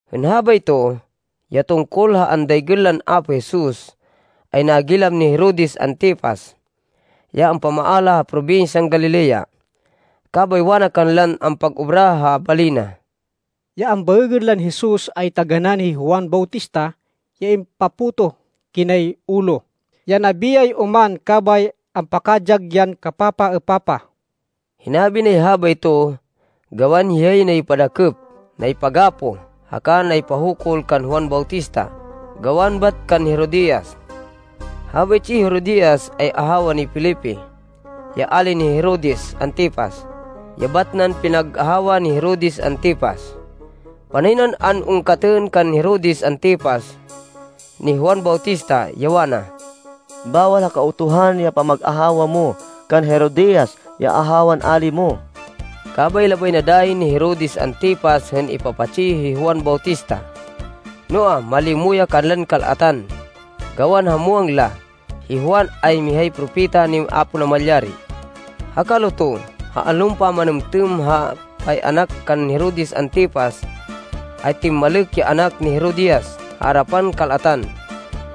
Hên habayto, ya tungkol ha andaygên lan Apo Jesus ay nagilam ni Herodes Antipas, ya ampamaala ha probinsyan Galilea. Kabay wana kanlan ampag-obra ha bali na, “Ya ambaêgên lan Jesus, ay taganán hi Juan Bautista ya impapotoh kinay ulo, ya nabiyay oman, kabay ampakadyag yan kapapaêpapah!” Hinabi nay habayto gawan hiyay naypadakêp, naypagapoh, haka naypahukul kan Juan Bautista gawan bat kan Herodias. Habaytsi hi Herodias, ay ahawa ni Felipe, ya ali ni Herodes Antipas, ya bat nan pinag-ahawa ni Herodes Antipas. Panay nan an-ungkatên kan Herodes Antipas, ni Juan Bautista, ya wana, “Bawal ha Kautuhan ya pamag-ahawa mo kan Herodias, ya ahawan ali mo!” Kabay labay na dayi ni Herodes Antipas hên ipapatsi hi Juan Bautista, noa, malimo ya kanlan kal-atan, gawan ha muwang la, hi Juan ay mihay propeta ni Apo Namalyari. Ha kaluto, ha allon pamanêmtêm ha pay-anak kan Herodes Antipas, ay timmalêk ya anak ni Herodias ha arapan kal-atan.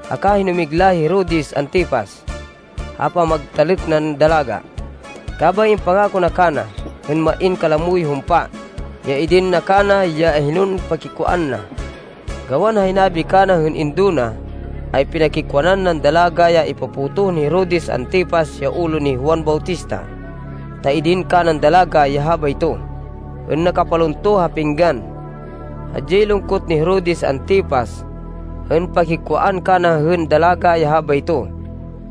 Haka hinumigla hi Herodes Antipas ha pamagtalêk nan dalaga, kabay impangako na kana, hên main kalamoy humpa, ya idin na kana ya hinon pakikwaan na. Gawan ha hinabi kana hên indo na, ay pinakikwaan nan dalaga ya ipapotoh ni Herodes Antipas ya ulo ni Juan Bautista, ta idin kanan dalaga ya habayto, hên nakapalunto ha pinggan. Hadyay lungkot ni Herodes Antipas hên pakikwaan kana hên dalaga ya habayto,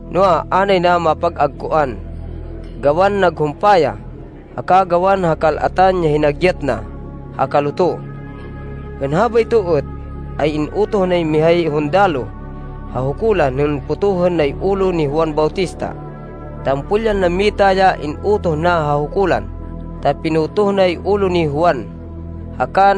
noa, a nay na mapag-agkoan, gawan naghumpa ya, haka gawan ha kal-atan ya hinagyat na ha kaluto. Hên habayto êt, ay in-utoh nay mihay hundaloh ha hukulan hên potohên nay ulo ni Juan Bautista. Tampol yan nammita ya in-utoh na ha hukulan, ta pinotoh nay ulo ni Juan, haka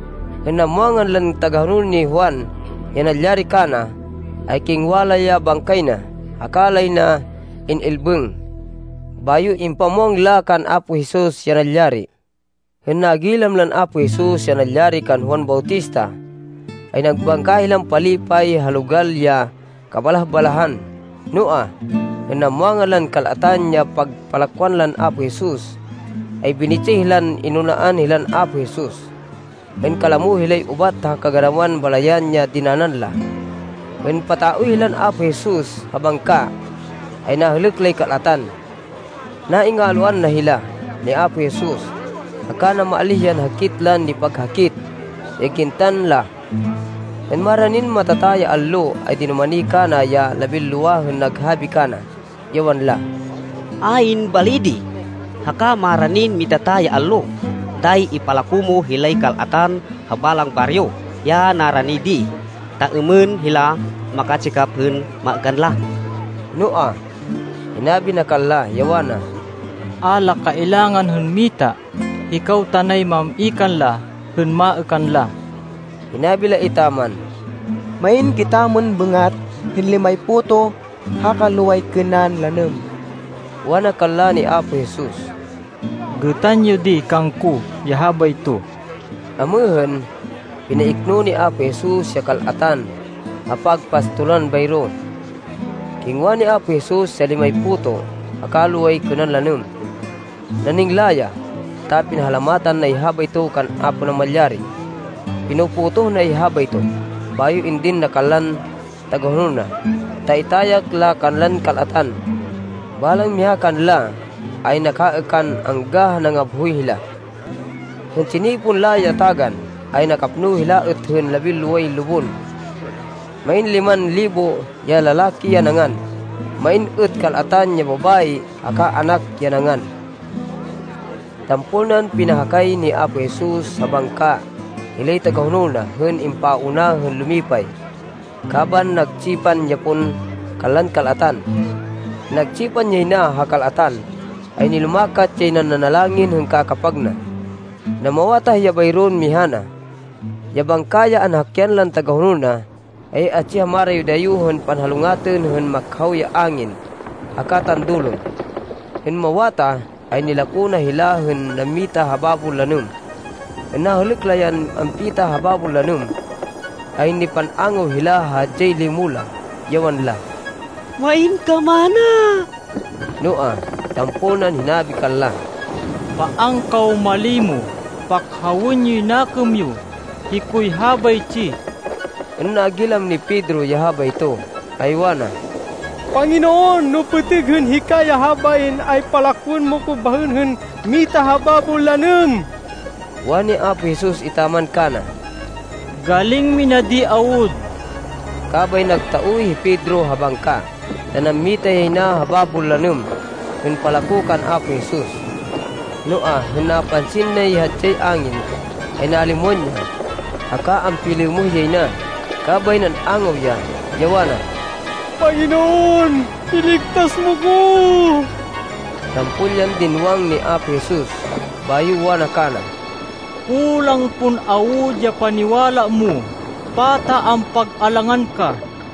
Hên namwangan lan tagahonol ni Juan ya nalyari kana, ay kingwa la ya bangkay na, haka lay na in-ilbêng. Bayo impamwang la kan Apo Jesus ya nalyari. Hên nagilam lan Apo Jesus ya nalyari kan Juan Bautista, ay nagbangka hilan palipay ha logal ya kabalah-balahan. Noa, hên namwangan lan kal-atan ya pagpalakwan lan Apo Jesus, ay binitsih lan inunaan hilan Apo Jesus, hên kalamo hilay ubat ha kaganawan balayan ya dinanan la. Hên pataoy hilan Apo Jesus ha bangka, ay nahêlêk lay kal-atan. Naingalwan na hila, ni Apo Jesus, haka namaalíh yan hakit lan nipaghakit ya gintan la. Hên maranin matata ya allo ay dinumani kana ya labinlowa hên naghabi kana, ya wanla, “Ayn bali di, haka maranin matata ya allo. Dayi ipalako mo hilay kal-atan ha balang baryo, ya narani di, ta êmên hila makatsikap hên maêkan la.” Noa, hinabi na kanla, ya wana, “A la kailangan hên mita. Hikaw tanay mam-i kanla hên maêkan la.” Hinabi la etaman, “Main kitamon bêngat hên limay puto haka loway kênan lanêm.” Wana kanla ni Apo Jesus, “Gêtan yo di kangko ya habayto.” Amêhên, pinaikno ni Apo Jesus ya kal-atan ha pagpastolan bayro. Kingwa ni Apo Jesus ya limay puto haka loway kênan lanêm. Naningla ya, ta pinahalamatan nay habayto kan Apo Namalyari. Pino-potoh nay habayto, bayo indin na kanlan tagahonol na, ta itayak la kanlan kal-atan. Balang miha kanla ay nakaêkan angga ha nangabhoy hila. Hên tsinipon la ya tagan, ay nakapno hila êt hên labinloway lubon. Main liman libo ya lalaki ya nangan. Main êt kal-atan ya babayi haka anak ya nangan. Tampol nan pinahakay ni Apo Jesus ha bangka hilay tagahonol na hên impauna hên lumipay, kaban nagtsipan ya pon kanlan kal-atan. Hên nagtsipan yay na ha kal-atan, ay nilumakat yan nanalangin hên kakapag na. Namawatah ya bayron miha na. Ya bangka ya anhakyan lan tagahonol na, ay atsi ha marayo-dayo hên panhalungatên hên makhaw ya angin haka tandulon. Hên mawatah, ay nilako na hila hên nammita ha babon lanêm. Hên nahêlêk la yan ampita ha babon lanêm, ay nipan-angaw hila ha hadyay limo la, ya wanla, “Main kamana!” Noa, tampol nan hinabi kanla, “Paan kaw malimo. Pakhawên yoy nakêm yo! Hikoy habaytsi.” Hên nagilam ni Pedro ya habayto, ay wana, “Panginoon, no pêtêg hên hika ya habain, ay palakwên mo ko bahên hên mita ha babon lanêm.” Wani Apo Jesus etaman kana, “Galing mina di awud!” Kabay nagtaoy hi Pedro ha bangka, ta nammita yay na ha babon lanêm hên palako kan Apo Jesus. Noa, hên napansin nay hadyay angin, ay nalimwan ya, haka ampilêmêh yay na, kabay nan-angaw ya, ya wana, “Panginoon, iligtas mo ko!” Tampol yan dinwang ni Apo Jesus, bayo wana kana, “Kulang pon awud ya paniwala mo! Pata ampag-alangan ka!”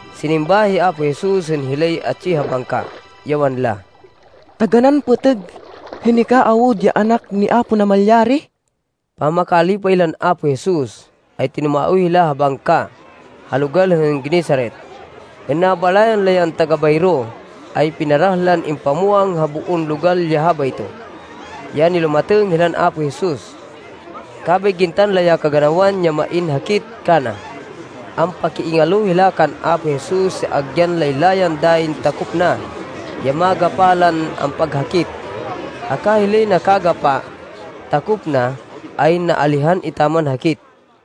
Sinimba hi Apo Jesus hên hilay atsi ha bangka, ya wanla, “Taganán pêtêg hên hika awud ya Anak ni Apo Namalyari!” Pamakalipay lan Apo Jesus, ay tinumaoy hila ha bangka ha logal hên Genesaret. Hên nabalayan la yan taga-bayro, ay pinarah lan impamwang ha boon logal ya habayto, ya nilumatêng hilan Apo Jesus. Kabay gintan la ya kaganawan ya main hakit kana. Ampakiingalo hila kan Apo Jesus ya agyan laylayan dayin takop na, ya magapa lan ampaghakit. Haka hilay nakagapa takop na, ay naalihan etaman hakit.